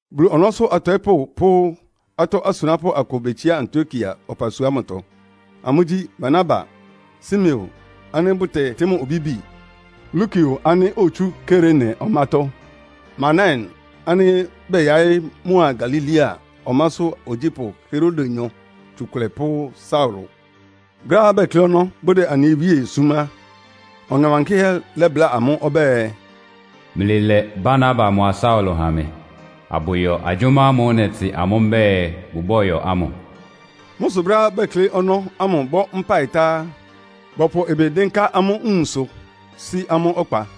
Bulu ɔnɔ́sʋ́ atɔɩ́pʋ́ pʋ́ atɔ́ asunápʋ́ akʋ betsiá Antiokia ɔpasua ámʋtɔ. Amʋ́gyí: Barnaba, Simeon ánɩ́ bʋtɛtɩ́ mʋ Obibi, Lukio ánɩ́ otsú Kirene ɔmátɔ́, Manaen ánɩ́ bɛyaɩ́ mʋa Galilea ɔmásʋ́ ogyípʋ́ Herodenyɔ tsukʋlɛ pʋ́ Saulo. Brɛ́á bɛklɩ́ ɔnɔ́, bʋdɛ anɩ Wíe súm á, Ɔŋɛ Wankɩ́hɛ́ lɛ́bláa amʋ́ ɔbɛ́ɛ, “Mlɩlɛ Barnaba mʋa Saulo ha mɩ, abʋyɔ agyʋ́má ámʋ́ʋ́ nɛtɩ amʋ́ mbɛ́ɛ bʋbɔ́yɔ ámʋ.” Mʋ́ sʋ brɛ́á bɛklɩ́ ɔnɔ́ ámʋ bɔ́ mpáɩ tá á, bɔpʋ ɩbɩ dɩ́nká amʋ́ nwunsʋ, sí amʋ́ ɔkpa.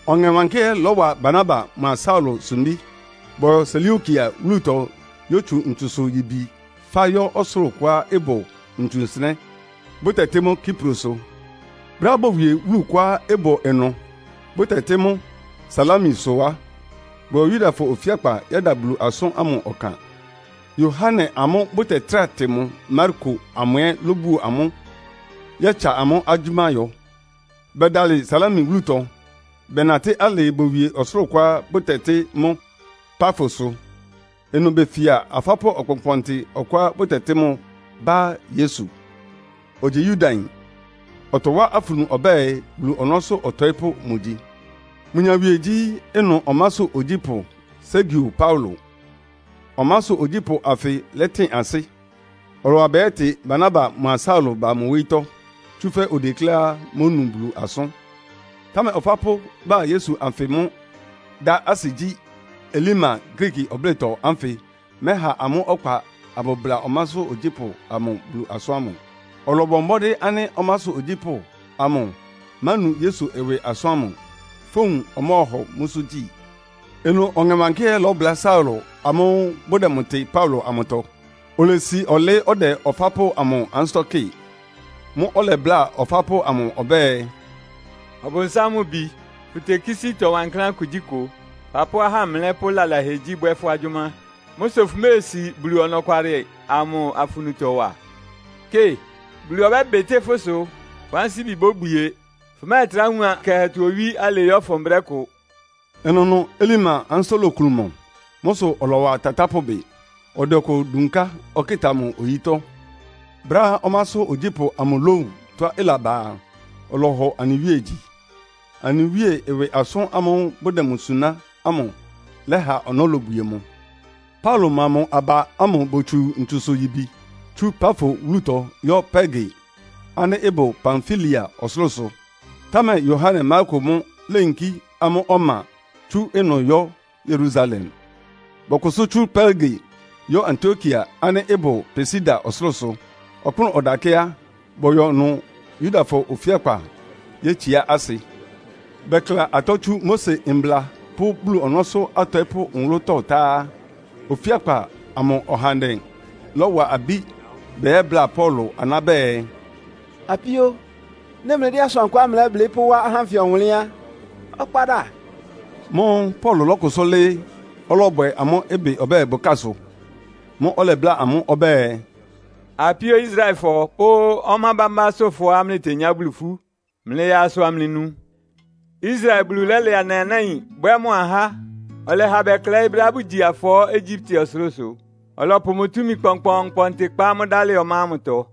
Ɔŋɛ Wankɩ́hɛ́ lɔ́wa Barnaba mʋa Saulo sumbí. Bɔyɔ Seleukia wúlutɔ yótsu ntsusʋ-yibi fá yɔ́ ɔsʋlʋ́ʋ kʋá ɩbʋ ntsu nsɩnɛ́, bʋtɛtɩ́ mʋ́ Kiprosʋ. Brɛ́á bowie wúlu kʋá ɩbʋ ɩnʋ, bʋtɛtɩ́ mʋ́ Salamisʋ á, bɔyɔ Yudafɔ ofíakpa yɛ́da Bulu asʋ́n ámʋ ɔkan. Yohane ámʋ́ʋ́ bʋtɛtráa tɩ mʋ Marko amʋ ɛ́ lóbuo amʋ́ yɛ́tsa amʋ́ agyʋ́má yɔ. Bɛdalɩ Salami wúlutɔ, bɛnatɩ́ alɩɩ bowie ɔsʋlʋ́ʋ kʋá bʋtɛtɩ́ mʋ́ Pafosʋ. Ɩnʋ befia ɔfápʋ́ kpɔnkpɔntɩ ɔkʋá bʋtɛtɩ́ mʋ Bar-Yesu. Ogyi Yudayin, ɔtɔwá afunu ɔbɛ́ɛ Bulu ɔnɔ́sʋ́ ɔtɔɩ́pʋ́ mʋgyi. Mʋ nyawie gyí ɩnʋ ɔmásʋ́ ogyípʋ́ Sergio Paulo. Ɔmásʋ́ ogyípʋ́ anfɩ lɛ́tɩn ansɩ́. Ɔlɔwa bɛyɛ́tɩ Barnaba mʋa Saulo ba mʋ wóyítɔ́. Tsúfɛ́ odekléá mónu Bulu asʋ́n. Támɛ ɔfápʋ́ Bar-Yesu anfɩ́ mʋ dá asɩ gyí, Elima Griiki ɔblɩ́tɔ anfɩ mɛ́ha amʋ́ ɔkpa abʋbla ɔmásʋ́ ogyípʋ́ amʋ Bulu asʋ́n ámʋ. Ɔlɔbɔ mbɔ́dɩ́ ánɩ́ ɔmásʋ́ ogyípʋ́ amʋ mánu Yesu ɩwɩ asʋ́n ámʋ, fówun ɔmɔ́ɔhɔ mʋ́sʋ́ gyi. Ɩnʋ Ɔŋɛ Wankɩ́hɛ́ lɔ́bʋlá Saulo amʋ́ʋ́ bʋdɛ mʋ tɩ Paulo amʋtɔ, olesi ɔlɩɩ́ ɔdɛ ɔfápʋ́ amʋ ansɩ́tɔ́ kɩ́ɩ. Mʋ́ʋ́ ɔlɛbláa ɔfápʋ́ amʋ ɔbɛ́ɛ, “Ɔbʋnsám mʋ bi, fʋtekísí ɩtɔ wankláán kugyíkʋ. Fapʋ́ ahámlɛ́ pʋ́ lalahɛgyí bwɛ́ fʋ́ agyʋ́má. Mʋ́ sʋ fʋméesi Bulu ɔnɔkwalɩ amʋ afunutɔ wa? Kɩ, Bulu ɔbɛ́bɩtɩ́ fʋ́ ɩsʋ. Fʋ́ ansíbi bóbwie. Fʋmɛ́ɛtrá wun ɔyɩ kɛhɛtɔ owí alɩɩ yɔ́fʋn brɛ́ kʋ.” Ɩnʋnʋ Elima ansɩ́tɔ́ loklun mʋ. Mʋ́ sʋ ɔlɔwa tatápʋ bɩ, ɔdɛ ɔkʋ dunká ɔkɩta mʋ oyítɔ́. Brɛ́á ɔmásʋ́ ogyípʋ́ amʋ lówun tɔ́á ɩlaba a, ɔlɔhɔ anɩ Wíe gyi. Anɩ Wíe ɩwɩ asʋ́n ámʋ́ʋ́ bʋdɛ mʋ suná ámʋ lɛha ɔnɔ́ lobwie mʋ. Paulo mʋa mʋ aba ámʋ botsu ntsusʋ-yibi tsú Pafo wúlutɔ yɔ́ Perge ánɩ́ ɩbʋ Pamfilia ɔsʋlʋ́sʋ. Támɛ Yohane Marko mʋ́ léyinkí amʋ́ ɔma tsú ɩnʋ yɔ́ Yerusalem. Bɔkʋsʋ́ tsú Perge yɔ́ Antiokia ánɩ́ ɩbʋ Pisidia ɔsʋlʋ́sʋ. Ɔkpʋ́nʋ́ ɔdakɛ́ á, bɔyɔ ɩnʋ Yudafɔ ofíakpa yétsiá asɩ. Bɛkla atɔ́ tsú Mose Mbla pʋ́ Bulu ɔnɔ́sʋ́ atɔɩ́pʋ́ nwʋlʋ́tɔ́ ta á, ofíakpa amʋ ahandɛ bɔwa abí bɛyɛ́bláa Paulo aná bɛɛ, “Apíó, nɩ́ mlɩdɛ́ asʋankʋá mlɛ́blɩ́ pʋ́wá ahá ánfɩ ɔwʋnlɩ́n á, ɔkpa da.” Mʋ́ʋ́ Paulo lɔ́kʋsʋ́ lɩ́ɩ́, ɔlɔbwɛ amʋ́ ɩbɩ ɔbɛ́ɛ bʋkásʋ. Mʋ́ʋ́ ɔlɛbláa amʋ́ ɔbɛ́ɛ, “Apíó Israelfɔ pʋ́ ɔmá bámbásʋ́fɔá mlɩtenyá Bulu ifú, mlɩyaa asʋ amlɩnu. Israel Bulu lɛ́lɛ anɩ anáin bwɛ́ mʋ ahá. Ɔlɛha bɛklɛɩ́ brɛ́á bʋgyi afɔɔ́ Egyipte ɔsʋlʋ́sʋ. Ɔlɔpʋ mʋ túmi kpɔnkpɔɔnkpɔntɩ kpá amʋ́ dalɩ ɔmá ámʋtɔ.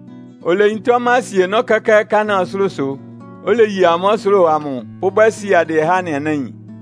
Oleyintá ɔmá asienɔ́ kɛ́kɛ́ Kanaan ɔsʋlʋ́sʋ, oleye amʋ́ ɔsʋlʋ́ʋ amʋ pʋ́bwɛ́ siadɩɛ há anɩ anáin.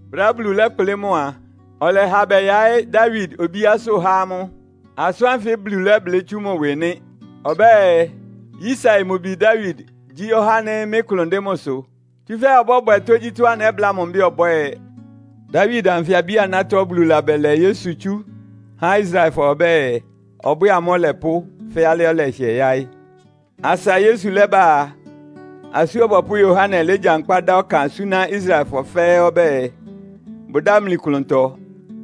Brɛ́á Bulu lɛ́kplɩ́ mʋ a, ɔlɛha bɛyaɩ́ Dawid obíásʋ́ há amʋ́. Asʋ́n ánfɩ Bulu lɛ́blɩ́ tsú mʋ ɩwɩ nɩ́. Ɔbɛ́ɛ, ‘Yisai mʋ bi Dawid gyí ɔhá ánɩ́ mɩ́ klʋn dɩn mʋsʋ, tsúfɛ́ ɔbɔ́bwɛ tógyítɔ́á nɛ́bláa mʋ mbɛ́ɛ ɔbwɛ́ɛ.’ “Dawid anfɩ abí-anátɔ́ Bulu labɛlɛ Yesu tsú há Israelfɔ ɔbɛ́ɛ, ɔbwɛ́ɛ amʋ́ Ɔlɛpʋ́ fɛ́ alɩá ɔlɛhɩɛ yáɩ́. Asa Yesu lɛ́bá a, Asú Ɔbɔpʋ́ Yohane légyankpá dá ɔkan súná Israelfɔ fɛ́ɛ́ ɔbɛ́ɛ, bʋdámli klʋntɔ,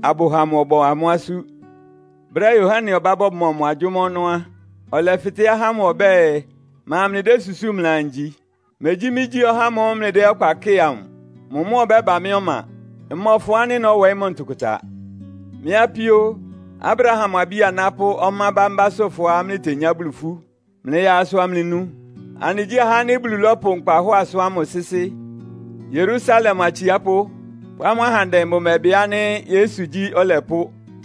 abʋha mʋ ɔbɔ amʋ́ asú. Brɛ́á Yohane ɔbá bɔmɔ mʋ agyʋ́má ɔnɔ́ á, ɔlɛfɩtɛ́ ahá ámʋ ɔbɛ́ɛ, ‘Ma mlɩdésusúu mlɩaa ngyi? Megyí mɩ́gyí ɔhá ámʋ́ʋ́ mlɩdɛ́ ɔkpa kɩ́ɩ amʋ. Mʋ mʋ́ ɔbɛ́ba mɩ́ ɔma. Mmɔfʋn ánɩ́ nɔ́wɔɩ́ mʋ ntʋkʋta.’ “Mɩ́ apíó, Abraham abí-aná pʋ́ ɔmá bámbásʋ́fɔá mlɩtenyá Bulu ifú, mlɩyaa asʋ amlɩnu. Anɩgyí ahá ánɩ́ Bulu lɔ́pʋ nkpahɔ́ɔ asʋ́n ámʋ sɩ́sɩ́. Yerusalem atsiápʋ́ pʋ́ amʋ́ ahandɛ bʋmɛbɩ ánɩ́ Yesu gyí Ɔlɛpʋ́.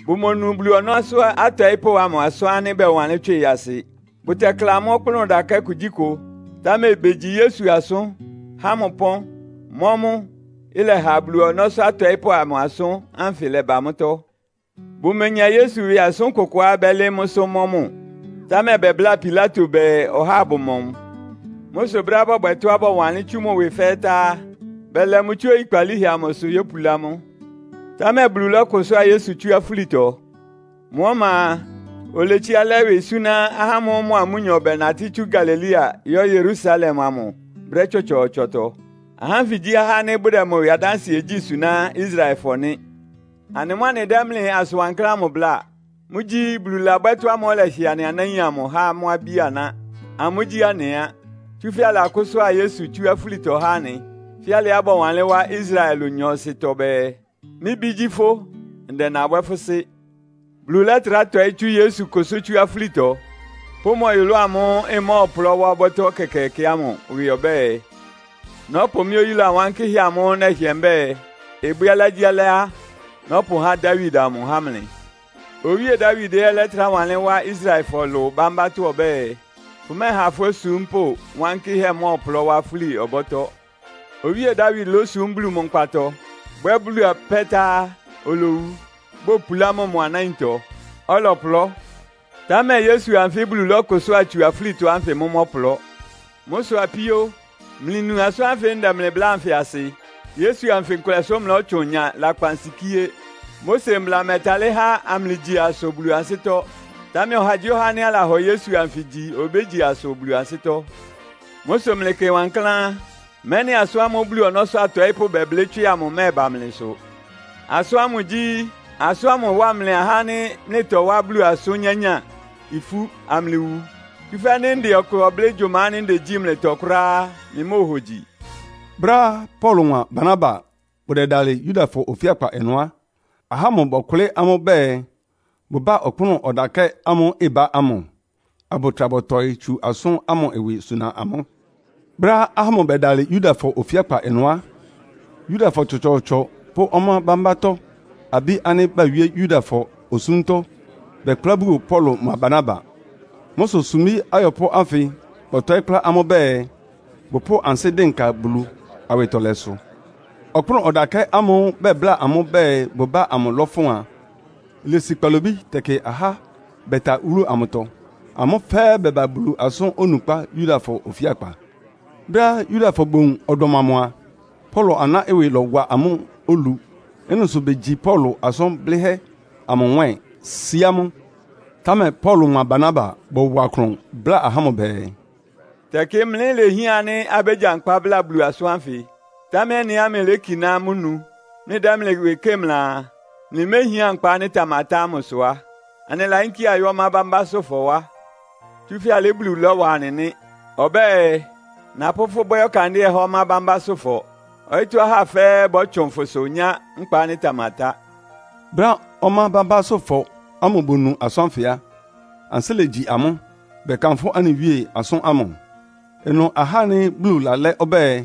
Bʋmonu Bulu ɔnɔ́sʋ́ atɔɩ́pʋ́ amʋ asʋ́n ánɩ́ bɔwanlɩ́n tswɩ asɩ. Bʋtɛkla mʋ́ ɔkpʋ́nʋ́ ɔdakɛ́ kugyíkʋ. Támɛ begyi Yesu asʋ́n, há mʋ ɩpɔ́n, mɔ́ mʋ; ɩlɛha Bulu ɔnɔ́sʋ́ atɔɩ́pʋ́ amʋ asʋ́n ánfɩ lɛba mʋ́tɔ́. Bʋmenya Yesu ɩwɩ asʋ́n kʋkʋá bɛ́lɩɩ́ mʋ́sʋ́ mɔ́ mʋ, támɛ bɛbláa Pilato bɛɛ ɔhá abʋmɔ mʋ. Mʋ́ sʋ brɛ́á bɔbwɛ tɔ́á bɔwanlɩ́n tsú mʋ ɩwɩ fɛ́ɛ́ tá á, bɛlɛ mʋ tsú oyikpalíhɛ amʋsʋ yópulá mʋ. Támɛ Bulu lɔ́kʋsʋ́a Yesu tsú afúlitɔ. Mʋ́ ɔma a, oletsiá lɛ ɩwɩ súná ahá ámʋ́ʋ́ mʋa amʋ́nyɔ bɛnatɩ́ tsú Galilea yɔ́ Yerusalem amʋ brɛ́ tsɔtsɔɔtsɔtɔ. Ahá ánfɩ gyí ahá ánɩ́ bʋdɛ mʋ ɩwɩ adánsɩɛ gyí suná Israelfɔ nɩ́. “Anɩ mʋ́ anɩdɛ́ mlɩ asʋn wankláán ámʋ bláa. Mʋ́gyí, Bulu labwɛ́ tɔ́ ámʋ́ʋ́ ɔlɛhɩɛ anɩ anáin amʋ há amʋ́ abí-aná. Amʋ́gyí anɩ á. Tsúfɛ́ alakʋ́sʋ́a Yesu tsú afúlitɔ há anɩ, fɛ́ alɩá bɔwanlɩ́n wá Israelfɔ ɩlʋ nyɔɔsɩtɔ bɛɛ, ‘Mɩ́ Bí gyí fʋ́. Ndɛ nabwɛ́ fʋ́ Sɩ́.’ Bulu lɛ́trá tɔɩ́ tsú Yesu kʋsʋ́ tsú afúlitɔ pʋ́ mʋ ɔyʋlʋ́ʋ amʋ́ʋ́ ɩmɔ́ɔplɔ́ wá ɔbɔ́tɔ́ ɛkɛkɛɛkɛ ámʋ ɩwɩ ɔbɛ́ɛ, ‘Nɔ́pʋ mɩ́ oyúla wankɩ́hɛ́ amʋ́ʋ́ nɛhɩɛ mbɛ́ɛ, ɩbwɛ́ alɩágyíalɩ́á nɔ́pʋhá Dawid amʋ há mlɩ.’ Owíe Dawid ɛ́ lɛ́trá lawánlɩ́n wá Israelfɔ Ɩlʋ bámbátɔ́ ɔbɛ́ɛ, ‘Fʋmɛ́ɛha fʋ́ osúmpʋ́ wankɩ́hɛ́ mɔ́ɔplɔ́ wá fúli ɔbɔ́tɔ́.’ Owíe Dawid lósum Bulu mʋ nkpatɔ, bwɛ́ Bulu apɛ́ tá á, olowu, bopulá mʋ mʋ anáintɔ, ɔlɔplɔ́. Támɛ Yesu anfɩ́ Bulu lɔ́kʋsʋ́a tsu afúlitɔ ánfɩ mʋ́ mɔ́plɔ. Mʋ́ sʋ apíó, mlɩnu asʋ́n ánfɩ anɩdɛ́ mlɩ bláa anfɩ asɩ. Yesu anfɩ nkʋlɛsʋ mlɔ́tsʋn nya lakpansikíé. Mose mbla mɛ́talɩ́ há amlɩgyi asʋ Bulu ansɩ́tɔ́. Támɛ ɔhagyíɔha ánɩ́ alahɔ Yesu anfɩ gyi obégyi asʋ Bulu ansɩ́tɔ́. Mʋ́ sʋ mlɩkɩ wankláán, mɛ́nɩ asʋ́n ámʋ́ʋ́ Bulu ɔnɔ́sʋ́ atɔɩ́pʋ́ bɛblɩ́ tswɩ amʋ mɛ́ɛba mlɩsʋ. Asʋ́n ámʋ gyí, ‘Asʋ́n ámʋ ɩwá mlɩ ahá ánɩ́ mlɩtɔwá Bulu asʋ́n nyányáa ifú, amlɩwu. Tsúfɛ́ nɩ́ ndɛ ɔkʋ ɔblɩ́ gyʋma ánɩ́ ndegyí mlɩtɔ kʋ́ráá á, mlɩmóohogyi.’” Brɛ́á Paulo mʋa Barnaba bʋdɛdalɩ Yudafɔ ofíakpa ɩnʋ á, ahá ámʋ bɔkʋlɩ́ amʋ́ bɛɛ bʋbá ɔkpʋ́nʋ́ ɔdakɛ́ ámʋ́ʋ́ ɩbá ámʋ, abʋtra bɔtɔɩ́ tsu asʋ́n ámʋ ɩwɩ suna amʋ́. Brɛ́á ahá ámʋ bɛdalɩ Yudafɔ ofíakpa ɩnʋ á, Yudafɔ tsɔtsɔɔtsɔ pʋ́ ɔmá bámbátɔ́ abí ánɩ́ bawíé Yudafɔ osúmtɔ́ bɛkplá buo Paulo mʋa Barnaba. Mʋ́ sʋ sumbí ayɔpʋ́ ánfɩ bɔtɔɩ́ kplá amʋ́ bɛɛ, bʋpʋ́ʋ ansɩ́ dɩnka Bulu awɩtɔlɛsʋ. Ɔkpʋ́nʋ́ ɔdakɛ́ amʋ́ʋ́ bɛbláa amʋ́ bɛɛ bʋbá amʋ lɔ́fʋn a, ilesi kpalobí tɛkɩ ahá bɛta wúlu amʋtɔ. Amʋ́ fɛ́ɛ́ bɛba Bulu asʋ́n onukpá Yudafɔ ofíakpa ɩnʋ. Brɛ́á Yudafɔ bowun ɔdɔm amʋ a, Paulo aná ɩwɩ lɔ́wa amʋ́ olu. Ɩ́nɩ sʋ begyi Paulo asʋn blɩ́hɛ́ amʋ nwɛ́ɛn, síá mʋ. Támɛ Paulo mʋa Barnaba bɔwa klʋn bláa ahá ámʋ bɛɛ, “Tɛkɩ mlɩ lehián ánɩ́ abégyankpá bláa Bulu asʋ́n ánfɩ. Támɛ ɩ́nɩá mlɩlékiná mʋ́ nu, mlɩdɛ́ mlɩ ɩwɩ kɩ́ɩ mlɩaa, mlɩméhián nkpa ánɩ́ ɩtamatá ámʋ sʋ á, anɩlayínkí ayɔ́ ɔmá bámbásʋ́fɔ wá. Tsúfɛ́ alɩ́ Bulu lɔ́wa anɩ nɩ́. Ɔbɛ́ɛ, ‘Napʋ́ fʋ́ bwɛ́ ɔkandɩ́ɛ há ɔmá bámbásʋ́fɔ. Ɔyɩ́tɔ́ ahá fɛ́ɛ́ bɔ́tsʋn fʋsʋ nyá nkpa ánɩ́ ɩtamatá.’” Brɛ́á ɔmá bámbásʋ́fɔ ámʋ bonu asʋ́n ánfɩ á, ansɩ́ legyi amʋ́, bɛ́kanfʋ́ anɩ Wíe asʋ́n ámʋ. Ɩnʋ ahá ánɩ́ Bulu lalɛ́ ɔbɛ́ɛ,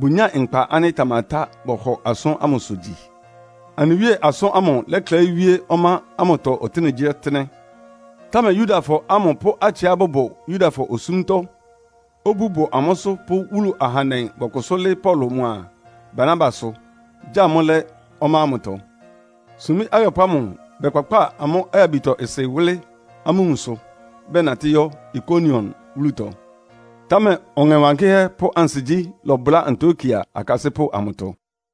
bʋnyáa nkpa ánɩ́ ɩtamatá bɔhɔ asʋ́n ámʋsʋ gyi. Anɩ Wíe asʋ́n ámʋ ɩlɛklɛɩ́ wíé ɔmá ámʋtɔ ɔtɩ́nɛgyíɔtɩ́nɛ́. Támɛ Yudafɔ ámʋ pʋ́ atsɩá bʋbʋ Yudafɔ osúmtɔ́, obú bʋ amʋ́sʋ́ pʋ́ wúlu ahandɛ bɔkʋsʋ́ lɩ́ɩ́ Paulo mʋa Barnabasʋ, gya amʋ́ lɛ́ ɔmá ámʋtɔ. Sumbí ayɔpʋ́ ámʋ bɛkpakpáa amʋ́ ayabitɔ-ɩsɩ wʋ́lɩ́ amʋ́ nwunsʋ, bɛnatɩ́ yɔ́ Ikonion wúlutɔ. Támɛ Ɔŋɛ Wankɩ́hɛ́ pʋ́ ansigyí lɔbʋlá Antiokia akasɩ́pʋ́ amʋtɔ.